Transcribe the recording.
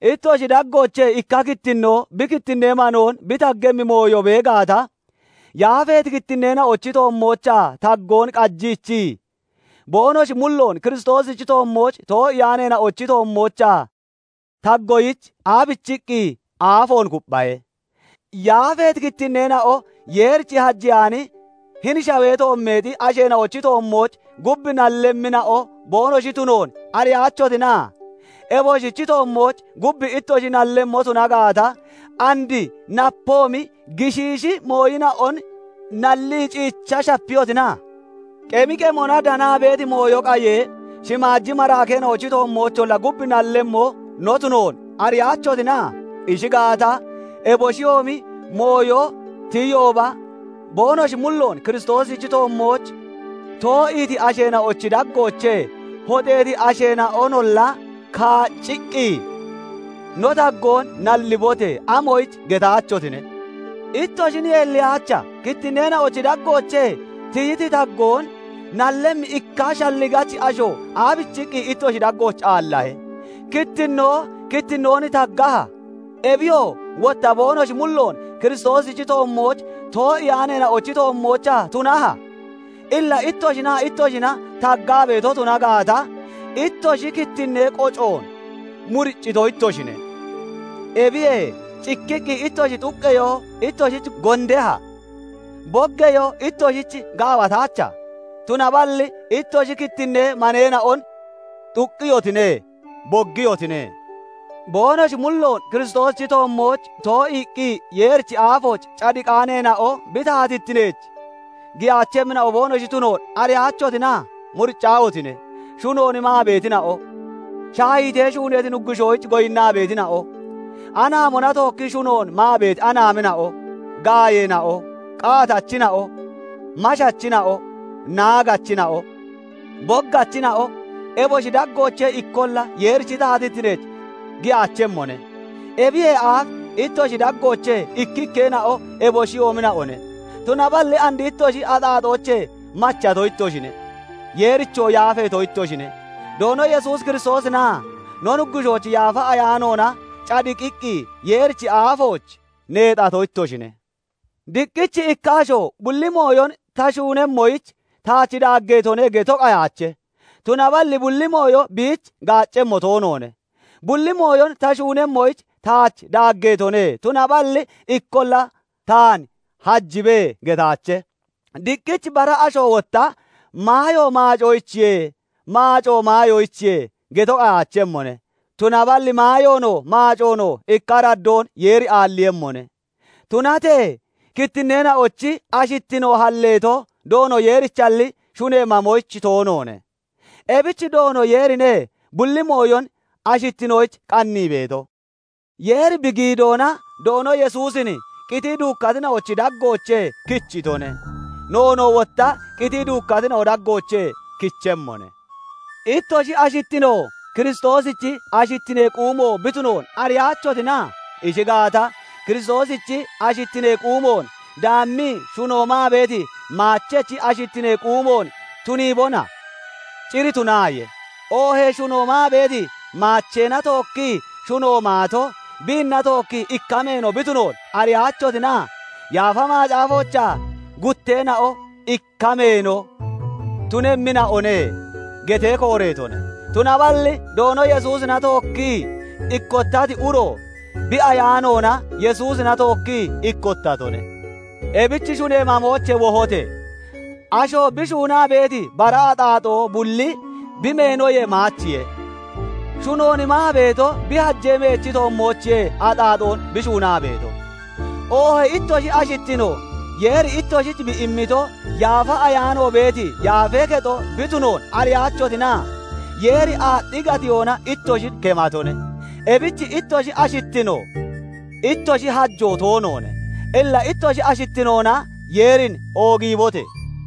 Ittoshi daggoochee ikka kittinnoo bi kittinnee manoon bi taggemmi mooyo bee gaata, yaafeeti kittinneena'ochi toommoochaa taggoon qajiichii, boonoshi mulloon Kiristoosichi toommooch too'iyaaneena'ochi toommoochaa taggoyich, aabichiqqi aafoon kupphahe? Yaafeeti kittinneena'o Yeerich hajeyaani hini shawee toommeexi asheena'ochi toommooch gub nallemmina'o boonoshi tunoon ariyaachotina? Eboshichi toommooch gub ittoshi nallemmo tuna gaata, and napoomi gishiishi mooyina'on nalli ciicha shapiyotina? Qemi qemona danaa beeti mooyo qayee, shimaaji maraakeena'ochi toommoocholla gub nallemmo no tunoon ariyaachotina? Ishi gaata, eboshiyoomi mooyo tiyiyooba, boonoshi mulloon Kiristoosichi toommooch too'iiti asheena'ochi daggoochee hoxeeti asheena'onolla kaacciqqi, "No taggoon nallibote!" amoyich getaachotine? Ittoshin yeelliyaacha? Kittinneena'ochi daggoochee tiyiti taggoon nallemmi ikka shalligachi asho aabichiqqi ittoshi daggooch aallahe? Kittinnoo kittinnoon taggaha? Ebiyoo wotta boonoshi mulloon Kiristoosichi toommooch too'iyaaneena'ochi toommoochaa tunaha? Illa ittoshinaa ittoshina taggaa beeto tuna gaata, ittoshi kittinnee qocoon muriccito ittoshine. Ebiyee cikkiqqi ittoshi xuqqeyoo ittoshich gondeha? Boggeyoo ittoshich gaawataacha? Tunaballi ittoshi kittinnee maneena'on xuqqiyotine; boggiyotine. Boonoshi mulloon Kiristoosichi toommooch too'iiqqi Yeerichi aafooch cadiqaaneena'o bi taatittineech giyaachemmina'o boonoshi tunoon ariyaachotina? Muriccaahotine! Shunoon maa beetina'o, shaahiitee shuuneeti nuggushoyich goyinnaa beetina'o, anaamona tookkii shunoon maa beeti anaamina'o, gaayeena'o, qaatachina'o, mashachina'o, naagachina'o, boggachina'o, eboshi daggoochee ikkolla Yeerichi taatittineech giyaachemmone. Ebiyee aaf ittoshi daggoochee ikkikkeena'o eboshiyoomina'one; tunaballi and ittoshi axaaxoochee machato ittoshine; Yeerichoo yaafeeto ittoshine; Doono Yesuus Kiristoosinaa no Nuggushoochi Yaafa Ayaanoona cadiqiqqi Yeerichi aafooch neexato ittoshine. Diqqich ikka asho "Bulli mooyon ta shuunemmoyich taach daaggeetone" geto qayaachemmone; tunaballi bulli mooyo biich gaaccemmo toonoone. "Bulli mooyon ta shuunemmoyich taach daaggeetone"; tunaballi "Ikkolla taan hajibe" getaache. Diqqich bara asho wotta "Maayo maacoyichiye; maacoo maayoyichiye" geto qayaachemmone; tunaballi maayoonoo, maacoonoo ikka araddoon Yeeri aalliiyemmone. Tunatee kittinneena'ochi ashittino halleeto Doono Yeerichalli, shunee maamoyich toonoone. Ebich Doono Yeerine bulli mooyon ashittinoyich qannii beeto. Yeeri bi giidoona Doono Yesuusin qitii duukkatina'ochi daggoochee kichitone; noonoo wotta qitii duukkatina'ochi daggoochee kichemmone. Ittoshi ashittino Kiristoosichi ashittinee quumo bi tunoon ariyaachotina? Ishi gaata, Kiristoosichi ashittinee quumoon daami shuno maa beeti maachechi ashittinee quumoon tuniibona? Cir tunaaye! Oohee shuno maa beeti maacheena tookkii shuno maato, biinna tookkii ikka meeno bi tunoon ariyaachotina? Yaafa Macaafoochaa "Gutteena'o ikka meeno tunemmina'one" getee kooreetone. Tunaballi Doono Yesuusina tookkii ikkottati uro bi ayaanoona Yesuusina tookkii ikkottatone. Ebich shunee mamoochee wohote! Asho bi shuunaa beeti bara axaaxoo bulli bi meenoyee maachiye; shunoon maa beeto bi hajee meechi toommoochiye axaaxoon bi shuunaa beeto. Oohee ittoshi ashittino Yeeri ittoshich bi immiti Yaafa Ayaano beeti yaafee kexo bi tunoon ariyaachotina? Yeeri aaxxi gatiyoona ittoshin kematone; ebich ittoshi ashittino ittoshi hajoo toonoone. Illa ittoshi ashittinoona Yeerin oogiibote!